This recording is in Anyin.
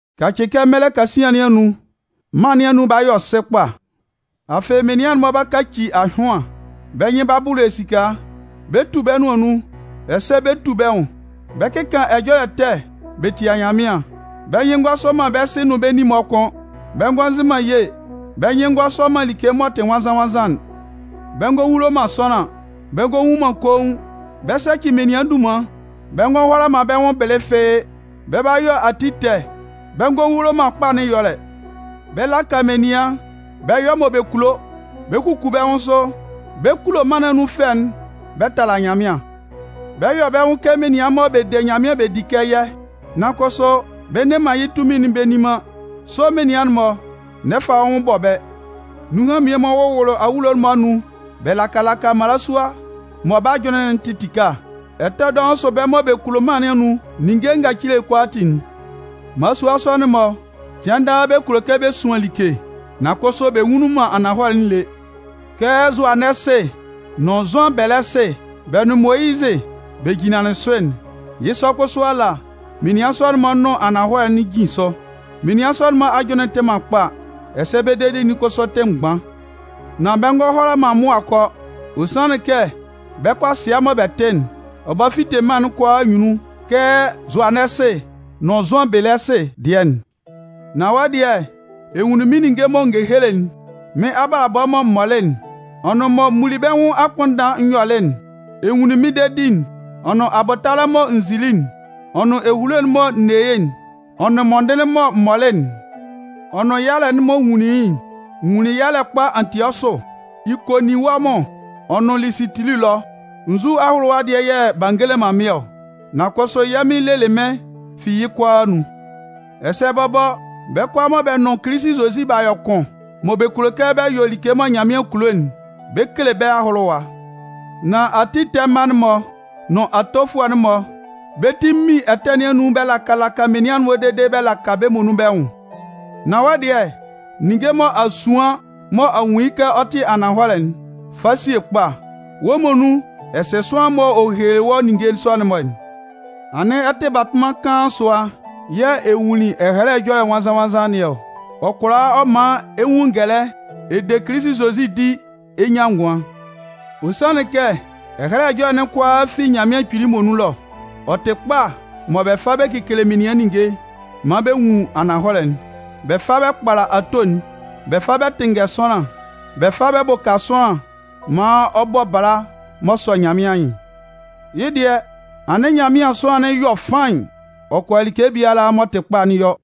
Kacɩ kɛ mɛlɛ kasian nɩn anun, mân nɩn anun 'ba yɔ sɩ kpa. Afɩ menian'n-mɔ 'ba kaci ahyʋan, bɛ́ nyɩn 'ba bʋlʋ esika, bɛ 'tu bɛ́ nʋan nun, ɛsɛ bɛ 'tu bɛ́ nwʋn. Bɛ 'kɩkan ɛjɔlɛ ɛtɛ bɛ tia Nyanmɩan, bɛ́ nyɩn ngɔ sɔ man bɛ́ sɩ nʋn bɛ́ nin-mɔ kʋ́n, bɛ ngɔ sɩ man ye, bɛ́ nyɩn ngɔ sɔ man like m'ɔ tɩ nwannzan-nwannzan'n. Bɛ ngɔ hulo man sʋanlan, bɛ ngɔ nwun man koun, bɛ 'sɛcɩ menian dunman, bɛ ngɔ hʋala man bɛ́ nwʋn bɩlɩ fɩ́ɩ́, bɛ 'ba yɔ ati ɛtɛ, bɛ ngɔ hulo man kpa nɩn ɛyɔlɛ. Bɛ 'laka menian, bɛ 'yɔ mɔ bɛ kulo, bɛ 'kuku bɛ́ nwʋn sʋ. Bɛ 'kulo mân nɩn anun fɛ'n bɛ tala Nyanmɩan. Bɛ 'yɔ bɛ́ nwʋn kɛ menian mɔ bɛ de Nyanmɩan bɛ di kɛ yɛ́, nan kʋsʋ bɛ nne man yɩ́ tunmin'n bɛ nni man. Sɔ menian'n-mɔ, n'ɛ fa wɔ́ nwʋn bɔ bɛ́. Nunhan mmie-mɔ wʋwʋlʋ awulo'n-mɔ anun bɛ laka laka mmalasua mɔ bɛ́ ajʋnnɩn'n tɩ tɩka, ɛtɛ dɔʋn sʋ bɛ́ mɔ bɛ kulo mân nɩn anun ninnge ngacile kʋalaatin'n. Mmalasua sɔ'n-mɔ, cɩan daa bɛ kulo kɛ bɛ suan like, nan kʋsʋ bɛ nwunlin man ananhɔlɛ'n lé. Kɛ Zʋanɛsɩ nʋn Zʋanbɛlɛsɩ, bɛ nun Moyizɩ, bɛ jinlanlɩn sʋ'n, yɩ́ sɔ kʋsʋ ala, menian sɔ'n-mɔ nʋn ananhɔlɛ'n jin sʋ. Menian sɔ'n-mɔ ajʋnlɩn tɩ man kpa, ɛsɛ bɛ́ dedi'n kʋsʋ tɩ mgban. Nan bɛ ngɔ hʋala man mʋa kɔ. Ɔ sanlɩn kɛ bɛ́ kʋasɩa mɔ bɛ tɩ'n, ɔ 'ba fite mân'n kʋalaa anyunnun kɛ Zʋanɛsɩ nʋn Zʋanbɛlɛsɩ dɩɛ'n. Nan wɔ́ dɩɛ, ɛ nwunlin mɩ́n ninnge mɔ n gekelelɩ'n, mɩ́n abalabɔ mɔ m mɔlɩ'n, ɔ nʋn mɔ m muli bɛ́ nwʋn akpʋnndan n yɔlɩ'n, ɛ nwunlin mɩ́n dedi'n, ɔ nʋn abʋtalɛ'n mɔ n zili'n, ɔ nʋn ehulo'n mɔ n ne yɩ́'n, ɔ nʋn mɔndɩnlɩn'n mɔ m mɔlɩ'n, ɔ nʋn yalɛ'n mɔ n nwunlin yɩ́'n. N nwunlin yalɛ kpa Antiɔsʋ, Ikoninwɔmʋn, ɔ nʋn Lisitili ɛlɔ. Nzu ahʋlʋwa dɩɛ yɛ̂ b'a ngele man mɩ́n ɔ? Nan kʋsʋ yɛ́ Mɩn lelɩ mɩ́n fi yɩ́ kʋalaa anun. Ɛsɛ bɔbɔ, bɛ́ kʋalaa mɔ bɛ nʋn Kilisi Zozi b'a yɔ kʋn, mɔ bɛ kulo kɛ bɛ yɔ like mɔ Nyanmɩan kulo'n, bɛ 'kele bɛ́ ahʋlʋwa. Nan ati ɛtɛ mma'n-mɔ nʋn atofʋɛ'n-mɔ, bɛ́ ti 'min ɛtɛ nɩn anun bɛ laka laka menian dede bɛ laka bɛ́ muonun bɛ́ nwʋn. Nan wɔ́ dɩɛ, ninnge mɔ a suan, mɔ a nwun yɩ́ kɛ ɔ tɩ ananhɔlɛ'n, fa sie kpa. Wɔ́ muonun, ɛ sɩ sʋanlan'n m'ɔ hehelelɩ wɔ́ ninnge sɔ'n-mɔ'n. Anɩn ɛ tɩ batʋnman kaan sʋa yɛ̂ ɛ nwunlin Ɛhɛlɛ Ɛjɔlɛ Nwannzan-nwannzan nɩn ɔ. Ɔ kʋala ɔ man ɛ nwun ngɛlɛ ɛ de Kilisi Zozi di ɛ nyan ngʋan. Ɔ sanlɩn kɛ Ɛhɛlɛ Ɛjɔlɛ'n kʋalaa fi Nyanmɩan Kpili muonun ɛlɔ. Ɔ tɩ kpa mɔ bɛ fa bɛ kekele menian ninnge maan bɛ nwun ananhɔlɛ'n. Bɛ fa bɛ kpala ato'n, bɛ fa bɛ tɩnngɛ sʋanlan, bɛ fa bɛ bʋka sʋanlan maan ɔ bɔ bala m'ɔ sɔ Nyanmɩan anyɩn. Yɩ́ dɩɛ, anɩn Nyanmɩan sʋanlan'n yɔ faɩn, ɔ kʋala like biala m'ɔ tɩ kpa'n yɔ.